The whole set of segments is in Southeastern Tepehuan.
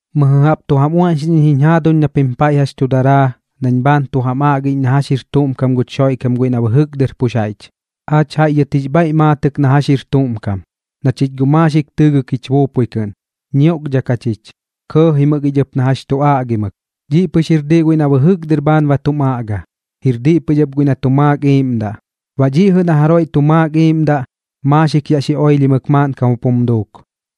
Mɨjɨ jaꞌp tu jam uaꞌñxiꞌñ iñ jiñ jaaduñ na pim paiꞌ jax tu daraa nañ bhaan tu jam aꞌgiꞌñ na jax jir tuꞌm kam guch Xoiꞌkam guiꞌ na bɨjɨk dɨr pux jaiꞌch. Aach jaiꞌ dhɨt jix bhaiꞌ maatɨk na jax jir tuꞌm kam, na chich guꞌ maaxik tɨɨgɨk jich buupui kɨꞌn, ñioꞌkdhak jachich, kɇɇjimɨk ich ɨp na jax tu aꞌgimɨk. Dhiꞌ pɨx jir diꞌ guiꞌ na bɨjɨk dɨr bhaan ba tum aꞌga, jir diꞌ pɨx ɨp guiꞌ na tu maak gu iiꞌmdaꞌ. Baꞌ dhiꞌ jɨꞌ na jaroiꞌ tu maak gu iiꞌmdaꞌ, maaxik yaꞌ xi oilhimɨk maaꞌnkam jup jum duuk.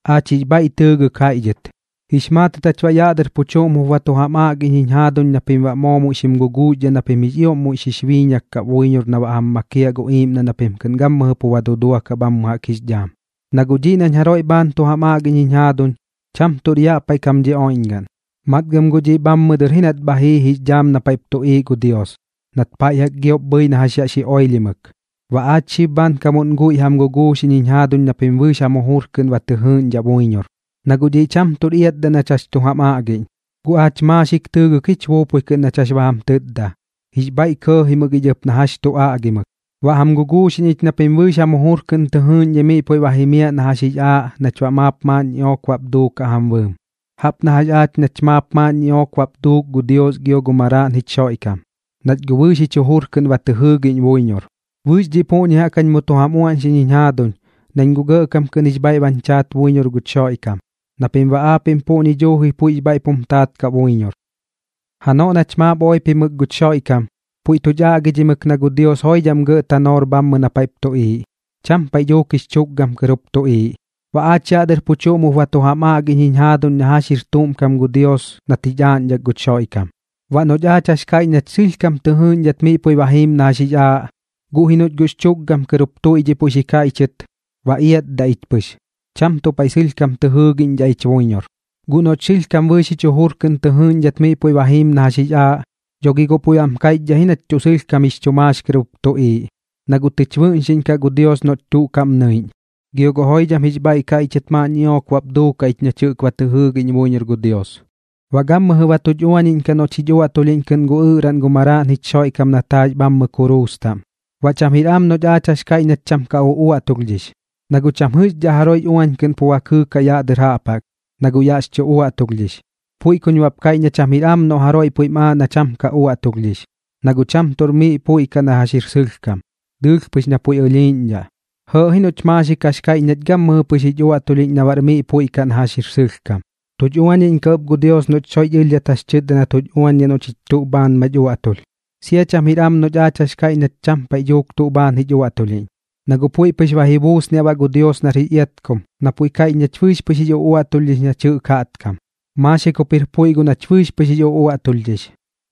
Aach jix bhaiꞌ tɨɨgɨk jaiꞌ dhɨt, jix maatɨt jach baꞌ yaꞌ dɨr pu chuꞌm jup ba tu jam aꞌgiꞌñ jiñ jaaduñ na pim baꞌ moo muiꞌ xim guguuxdhaꞌ na pim jix ioꞌm muiꞌ xix biiñak kaꞌ buiñor na baꞌ jam makiaꞌ gu iiꞌmdaꞌ na pim kɨꞌn gammɨjɨ pu ba duduakaꞌ bhammɨ jaꞌk jix dhaam. Na guꞌ dhiꞌ nañ jaroiꞌ bhaan tu jam aꞌgiꞌñ jiñ jaaduñ, cham tuꞌr yaꞌ paiꞌ kam dhi oiꞌñgaꞌn, matgɨm guꞌ dhiꞌ bhammɨ dɨr ji nat bha jii jix dhaam na paiꞌp tuꞌiiꞌ gu Dios, nat paiꞌ jaꞌk giop bhɨi na jax yaꞌ xi oilhimɨk. Baꞌ aach xib bhaankamuꞌn guiꞌ jam guguuxiꞌñ jiñ jaaduñ na pim bɨɨx jam jujur kɨꞌn ba tɨ jɨɨꞌñdhaꞌ buiñor. Na guꞌ dhiꞌ cham tuꞌr iatdaꞌ nach jax tu jam aꞌgiꞌñ, guꞌ aach maaxik tɨɨgɨk ji jich buupui kɨꞌn nañ jax ba jam tɨtda, jix bhaiꞌ kɇɇjimɨk ich na jax tu aꞌgimɨk. Baꞌ jam guguuxiꞌñ ich na pim bɨɨx jam jujur kɨꞌn tɨ jɨɨꞌñdhai miꞌ puiꞌ ba jimiaꞌ na jax jix aaꞌ nach baꞌ maap maaꞌn ñiꞌook bap duukaꞌ jam bɨɨm, jaꞌp na jax aach nach maap maaꞌn ñiꞌook bap duuk gu Dios gio gu Maraaꞌn jich Xoiꞌkam, nach guꞌ bɨɨx jich jujur kɨꞌn ba tɨ jɨɨgiꞌñ buiñor. Bɨɨx dhiꞌ puꞌñi jaꞌk jañ mu tu jam uaꞌñxiꞌñ jiñ jaaduñ, nañ guꞌ gɇꞌkam kɨꞌn jix bhaiꞌ bañ chaat buiñor guch Xoiꞌkam, na pim baꞌ aapiꞌm puꞌñi dhuuji puiꞌx bhaiꞌp jum taat kaꞌ buiñor. Janoꞌ nach maap oipimɨk guch Xoiꞌkam, puiꞌ tuch aꞌgidhimɨk na gu Dios joidham gɇꞌ tanoor bhammɨ na paiꞌp tuꞌiiꞌ, cham paiꞌ dhuuk jix chukgam kɨr jup tuꞌiiꞌ. Baꞌ aach yaꞌ dɨr pu chuꞌm jup ba tu jam aꞌgiꞌñ jiñ jaaduñ na jax jir tuꞌm kam gu Dios nat jich aaꞌñdhak guch Xoiꞌkam. Baꞌ noꞌch aach jax kaiꞌch nach sɨlhkam tɨ jɨɨꞌñdhat miꞌ puiꞌ ba jiim na jax jix aaꞌ, guꞌ ji noꞌch guꞌx chu tukgam tɨr jup tuꞌiiꞌ puiꞌ xi kaiꞌchɨt, ba iatdaꞌ ich pɨx, cham tuꞌ paiꞌ sɨlhkam tɨ jɨɨgiꞌñdhaꞌ ich buiñor. Guꞌ noꞌch sɨlhkam bɨɨx jich jujur kɨꞌn tɨ jɨɨꞌñdhat miꞌ puiꞌ ba jiim na jax jix aaꞌ, dho gi guꞌ puiꞌ bam kaiꞌch ji nach tuꞌ sɨlhkam jix chu maax kɨr jup tuꞌiiꞌ, na guꞌ tɨich bɨꞌñxiꞌñkaꞌ gu Dios noꞌch tuꞌ kaꞌm nɨiꞌñ. Gio guꞌ joidham jix bhaiꞌ kaiꞌchɨt maaꞌn ñiꞌook bap duukaꞌ ich nach jɨꞌk ba tɨ jɨɨgiꞌñ buiñor gu Dios, baꞌ gammɨjɨ ba tuch uañiꞌñkaꞌ noꞌch jich uaꞌtulhiꞌñ kɨꞌn gu ɨꞌraꞌn gu Maraaꞌn jich Xoiꞌkam nat jaax bhammɨ kuruus taꞌm. Baꞌ cham jir am noꞌch aach jax kaiꞌch nach cham ka uꞌuaꞌtulhdhix, na guꞌ cham jɨꞌxdhaꞌ jaroiꞌx uañ kɨꞌn pu ba kɨɨkaꞌ yaꞌ dɨr jaꞌp jaꞌk, na guꞌ yaꞌx chu uaꞌtulhdhix. Puiꞌ kuñ baꞌp kaiꞌch na cham jir am noꞌ jaroiꞌ puiꞌm aaꞌ na cham ka uaꞌtulhdhix, na guꞌ cham tuꞌr miꞌ puiꞌ kaꞌ na jax jir sɨlhkam, dɨɨlh pɨx na puiꞌ ɨlhiiꞌñdhaꞌ. Jɇɇꞌ ji noꞌch maaxik jax kaiꞌch nach gammɨjɨ pɨx jich uaꞌtulhiꞌñ na baꞌr puiꞌ kaꞌ na jax jir sɨlhkam. Tuch uañiꞌñkaꞌ ɨp gu Dios noꞌch soiꞌch ɨlhdhat jax chɨtda na tuch uañdhaꞌ noꞌ chich tuꞌ bhaan mach uaꞌtulh. Sia cham jir am noꞌch jax kaiꞌch nach cham paiꞌ dhuuk tuꞌ bhaan jich uaꞌtulhiꞌñ, na guꞌ puiꞌ pɨx ba ji buusniaꞌ baꞌ gu Dios nar jix iatkum, na puiꞌ kaiꞌch nach bɨɨx pɨx jix uꞌuaꞌtulhdhix nach jɨꞌk jaꞌtkam, maaxik jup jir puiꞌ guꞌ nach bɨɨx pɨx jix uꞌuaꞌtulhdhix.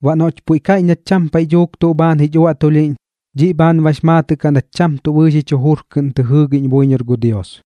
Baꞌ noꞌch puiꞌ kaiꞌch nach cham paiꞌ dhuuk tuꞌ bhaan jich uaꞌtulhiꞌñ, dhiꞌ bhaan bax maatɨꞌ kaꞌ nach cham tuꞌ bɨɨx jich jujur kɨꞌn tɨ jɨɨgiꞌñ buiñor gu Dios.